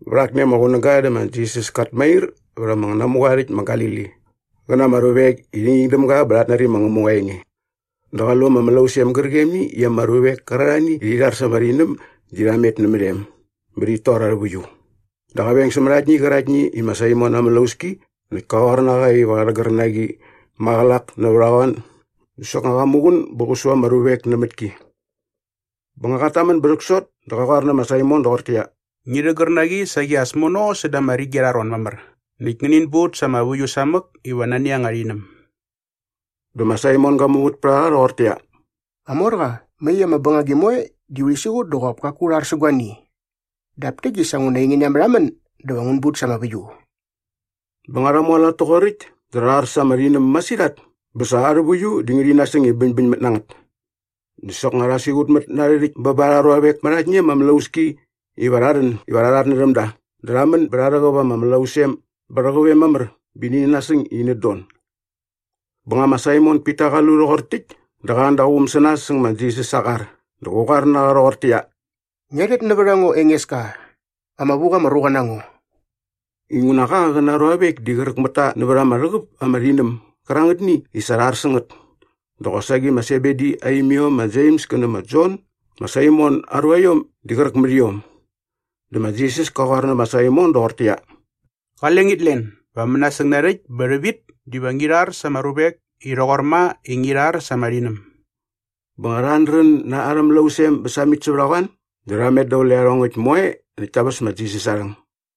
Vät akni ama qunäga dä ma Jisas kat mair vät ama namuqa aa rhäkt ma Galili qä na ama ruvek i rhi nging däm ga bä rhat nari ma Ngämuqa aa enge dä qa lu ama mlausem gärqemni i ama ruvek kärarhani i rhi rhar sa ama rhinäm di rha met nämät em bä rhit tor arhä väiu. Dä qa veng sämät aktni qärakt i ma Saimon aa mlauski näkt ka qoar na qa iva qä rhägär na qi maqälak nävät a qoan dä soknga qa muqun bä qä su ama ruvek nämät ki. Bä nga qat tamän bä rhäksot dä qa qoar nä ma Saimon doqortäqyia, “Ngi rhägär na qi saqi as mono säda ama rigi arha ron mamär näkt ngänin but sa ama väiu samäk iva nani anga rhinäm.” Dä ma Saimon ga muvät pät a qa rhoqortäqyia, “Qamorqa, mai ama bängagi moe di urhi siqut dä qop kaku u rhar sä guani. Dap täkt di sa nguna ainge ngia märhamän dä va ngun but sa ama väiu.” Bä nga rha mualat toqoräkt dä rha ar sa ama rhinäm masirhat bä sa arhä väiu di ngärhi nasäng iva bäñbäñmät na ngät. Dä soknga rha siqutmät na arhä rhäkt bä ba arha ruavek mät aktni ama mlauski iva rha rhän iva rha rhatnärhäm da dä rha män bä rha rhäqäp ama mlausem bä rhäqäp em mamär bä ini nasäng i inät don. Bä nga ma Saimon Pita qa lu rhoqor täkt dä qa an da aa quum sä nas säng ma Jisas aa qar dä qä qoar na qa rhoqortäqyia, “Ngia rhet nävät a ngo Engeska, ama vu qa ama ruqa na ngo!” Inguna qa qä na aa ruavek di qräk mät ta nävät ama rhäqäp ama rhinäm gärangätni i sa rha ar sä ngät dä qosaqi ma Sebedi aa imiom ma Jems kä nä ma Jon ma Saimon aa ruaiom di qräk mät iom. Dä ma Jisas kä qoar nä ma Saimon doqortäqyia, “Qale ngit len, va mänasäng narhäkt bä rhävit diva ngi rhar sa ama ruvek i rhoqor ma i ngi rhar sa ama rhinäm.” Bä nga rha ardrän na arhä mlausem bä samit sävät a qoan dä rha met daqule iarhongäkt moe näkt ta väs ma Jisas aa rhäng.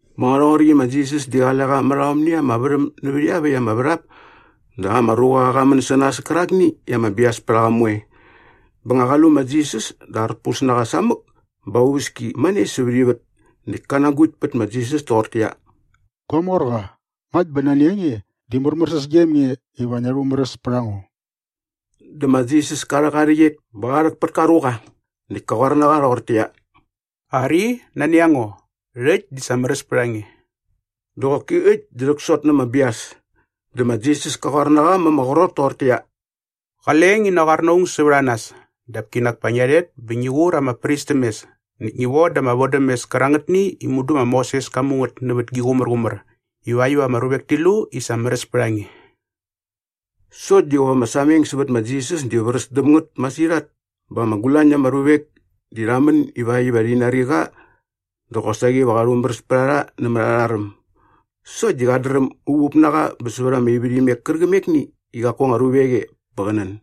Bä nga rhoqoräkt i ma Jisas di qale qa mät aomni ama värhäm nävät iaväkt ama värhap dä ama ruqa qä män sä nas kärakni i ama bias pät a qa moe. Bä nga qa lu ma Jisas dä arpus na qa samäk bä aa uväski mane sävät ivät näkt kä nagukt pät ma Jisas toqortäqyia, “Gua morqa, ngakt bä nani a nge di märmärsäs gem nge iva ngia rhumäräs pät a ngo.” Dä ma Jisas ka rhäk aa rhäqyet bä qa rhäk pät ka ruqa. Näkt ka qoar na qa rhoqortäqyia, “Ari, nani a ngo. Rhäkt di sa märäs pät a nge.” Dä qoki äkt dä rhäksot na ama bias. Dä ma Jisas ka qoar na qa ma ama qrot toqortäqyia, “Qale ngi naqoar na aung sävät a nas dap kinak pa ngia rhet bä ngi qur ama pris täm mes näkt ngi voda ama vodämes kärangätni i mudu ma Moses ka mu ngät nävät gi qumärqumär ivakt iva ama ruvek ti lu i sa märäs pät a nge.” Sokt di qop ama sameng sävät ma Jisas di vräs däm ngät masirhat bä ama gulañ na ama ruvek di rha män ivakt iva rhi nari qa dä qosaqi va qa rhumäräs pät a rha nämät arha räm. Sokt di qat dräm uvup na qa bä sävät ama ivärhimek kärqämekni i qaku anga ruvek e bä qä nän.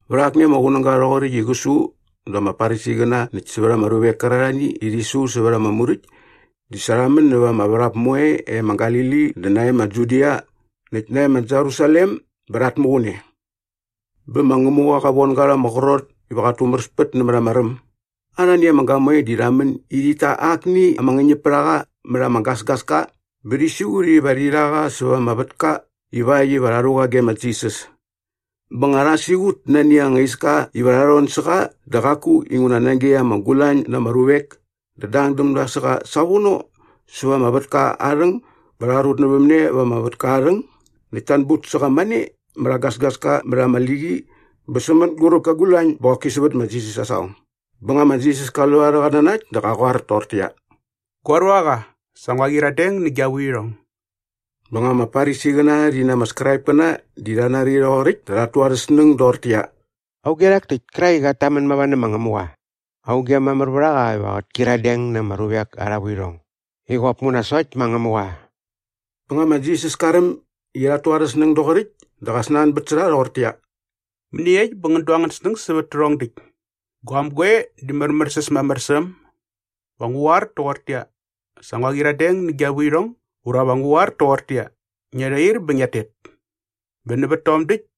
Vät akni ama qunäga rhoqoräkt i qä su dä ama Farisiqäna näkt sävät ama ruvek kärarhani i rhi su sävät ama Muräkt di sa rha män näva ama värhap moe e ma Galili dä nae ma Judia näkt nae ma Jerusalem bä rhat muqun e. Bä ma Ngämuqa qa von ga rha ama qrot iva qat tumäräspät nämät ama räm. Arhani ama gamoe di rha män i rhit ta akni ama ngäñäpärhaqa mät ama gasgaska bä rhi siqut iva rhi rha qa säva ama vätka ivakt iva rha rhu qa ge ma Jisas. Bä nga rha siqut nani anga iska iva rha rhon sä qa dä qaku inguna nage ama gulañ na ama ruvek dä dang däm da sä qa savono säva ama vätka aa rhäng bä rha rutnävämne va ama vätka aa rhäng näkt ta anbut sä qa mane mät aa gasgaska mät ama liqi bä sä mänguräp kä gulañ bä qoki sävät ma Jisas aa saqong. Bä nga ma Jisas ka lu arhä qatnanakt dä qä qoar toqortäqyia, “Gua ruaqa, sa ngua qyiradeng nä gia vuirhong.” Bä nga ama Farisiqäna rhi na ama Skraipkäna di rha nari rhoqoräkt dä rhat tu arhä snäng doqortäqyia, “Auge rhak täkt kärak i qat tamän mava nä ma Ngämuqa? Auge mamär vät a qa iva qät kyiradeng na ama ruvek arha vuirhong i qop nguna sokt ma Ngämuqa?” Bä nga ma Jisas ka räm i rhat tu arhä snäng doqoräkt dä qa snanbät sä rha rhoqortäqyia, “Mäniekt bä ngän du angän snäng bät tärhong däkt? Guaäm goe di märmärsäs mamär sä äm? Va ngu qoar toqortäqyia, ‘Sa ngua qyiradeng nä gia vuirhong’ ura va ngu qoar toqortäqyia, ‘Ngia rhair bä ngiat tet?’ Bä nävät tom däkt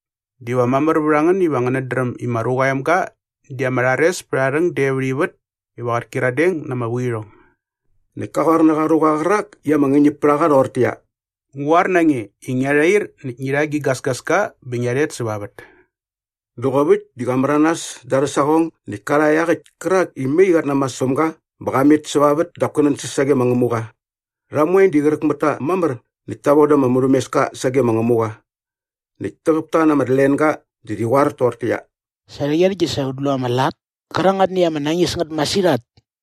diva mamär vät a ngän iva ngänät dräm i ma Ruqa aa Emga di ama rhares pät aa rhäng de vät ivät iva qät kyiradeng na ama vuirhong.” Näkt ka qoar nä qa ruqa qärak i ama ngäñäp pät a qa rhoqortäqyia, “Ngu qoar na nge i ngia rhair näkt ngi rha gi gasgaska bä ngia rhet säva vät.” Dä qop äkt di qa märanas da arhä saqong näkt ka rha iaqäkt kärak i mai qat namas päm ga bä qa met säva vät dap kä nänsäs sage ma Ngämuqa. Rha moe di qräk mät ta mamär näkt ta voda ama murhämeska sage ma Ngämuqa. Näkt täqäp ta na ama tlenga dä rhi qoar toqortäqyia, “Sa rhäqyerhäkt di sa ut lu ama lat kärangätni i ama nañis ngät masirhat.”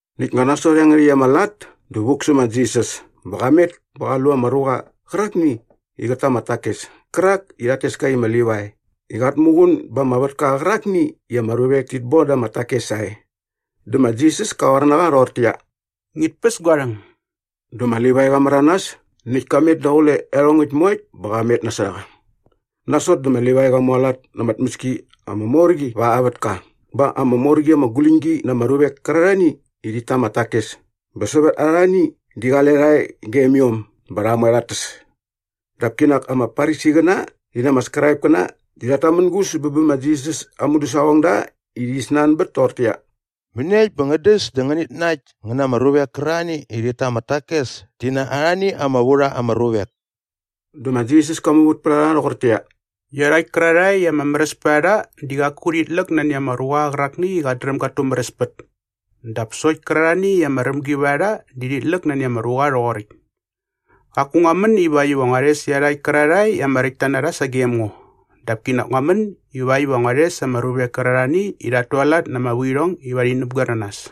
Näkt nga nasot iangärhäkt ama lat dä vuk sä ma Jisas bä qa met bä qa lu ama ruqa qärakni i qät ta ama takes kärak i rhat tes ka i ma Livai i qat muqun ba ama vätka qärakni i ama ruvek tit boda ama takes sae. Dä ma Jisas ka qoar na qa rhoqortäqyia, “Ngit päs gua rhäng.” Dä ma Livai qa märanas näkt ka met daqule iarhongäkt moekt bä qa met nasot a qa. Nasot dä ma Livai qa mualat na ama tmäski ama mor qi va aa vätka bä ama mor qi ama guläñgi na ama ruvek kärarhani i rhit ta ama takes bä sävät arhani di qale rha e gem iom bä rha moe rhat täs. Dap kinak ama Farisiqäna rhi na arhä Skraipkäna di rhat tamängus bä bä ma Jisas aa mudäsaqongda i rhi snanbät toqortäqyia, “Mäniekt bä ngän däs dä ngänit nakt ngän na ama ruvek kärarhani i rhit ta ama takes ti na arhani ama vu rha ama ruvek?” Dä ma Jisas ka muvät pät a rha rhoqortäqyia, “Iarhakt kärarhae i ama märäs pät a rha di qaku rhit läk nani ama ruqa qärakni i qat dräm gat tumäräspät dap sokt kärarhani i ama rämgi vät a rha di rhit läk nani ama ruqa rhoqoräkt. Qaku ngua män ivakt iva ngua rhes iarhakt kärarhae i ama räktta na rha sagem ngo dap kinak ngua män ivakt iva ngua rhes ama ruvek kärarhani i rhat tualat na ama vuirhong iva rhi näpgoer na nas.”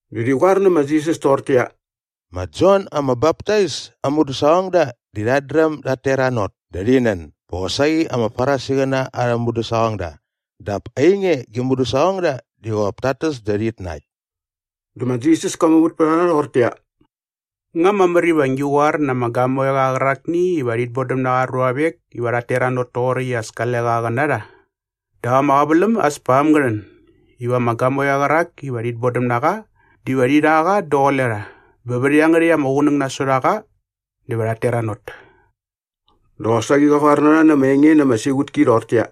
Dä rhi qoar nä ma Jisas toqortäqyia, “Ma Jon ama Baptais aa mudäsaqongda di rhat dräm dat teranot dä rhi nän bä qosaqi ama Farisiqäna arhä mudäsaqongda dap ainge gi mudäsaqongda di qop tat täs dä rhit nakt.” Dä ma Jisas ka muvät pät a rha rhoqortäqyia, “Nga mamär iva ngi qoar na ama gamoeqa qärakni iva rhit bodäm na qa aa ruavek iva rhat teranot toqoräkt i as kale qa qä na rha? Dap ama qäväläm as pa äm ngä rhän iva ama gamoeqa qärak iva rhit bodäm na qa diva rhi rha qa daqule rha bä vät iangärhäkt ama qunäng nasot a qa dä va rhat teranot.” Dä qosaqi qa qoar na rha na ama enge na ama siqutki rhoqortäqyia,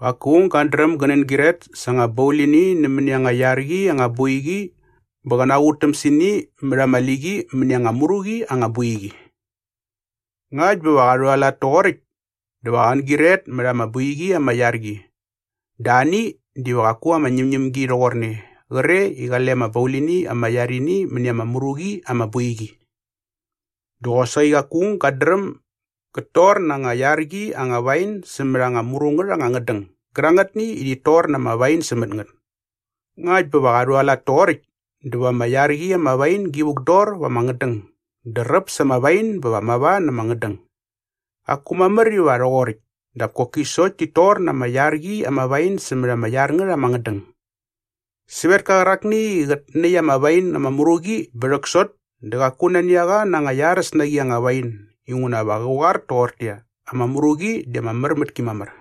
“Qaku aung gat dräm gä nängyiret sa anga baulini nämäni anga iar qi anga boiqi bä qä naqutäm sä ini mät ama liqi mäni anga mru qi anga boiqi. Ngakt bä va qa rhualat toqoräkt dä va qän gyiret mät ama boiqi ama iar qi dä ani diva qaku ama ñämñämgi rhoqorne qre i qale ama baulini ama iar ini mäni ama mru qi ama boiqi. “Dä qosaqi qaku aung gat dräm gät tor na anga iar qi anga wain sämät anga mru ngät anga ngädäng gärangätni i rhit tor na ama wain sämät ngät. Ngakt bä va qa rhualat toqoräkt dä va ama iar qi ama wain gi vukdor va ama ngädäng dä räp sa ama wain bä va mava na ama ngädäng. Qaku mamär iva rhoqoräkt dap koki sokt tit tor na ama iar qi ama wain sämät ama iar ngät ama ngädäng. “Sävetka qärakni i qät näkt ama wain ama mru qi bä rhäksot dä qaku nani a qa na anga iaräs na qi anga wain inguna va qä qoar toqortäqyia, ‘Ama mru qi di ama mär mät ki mamär.’”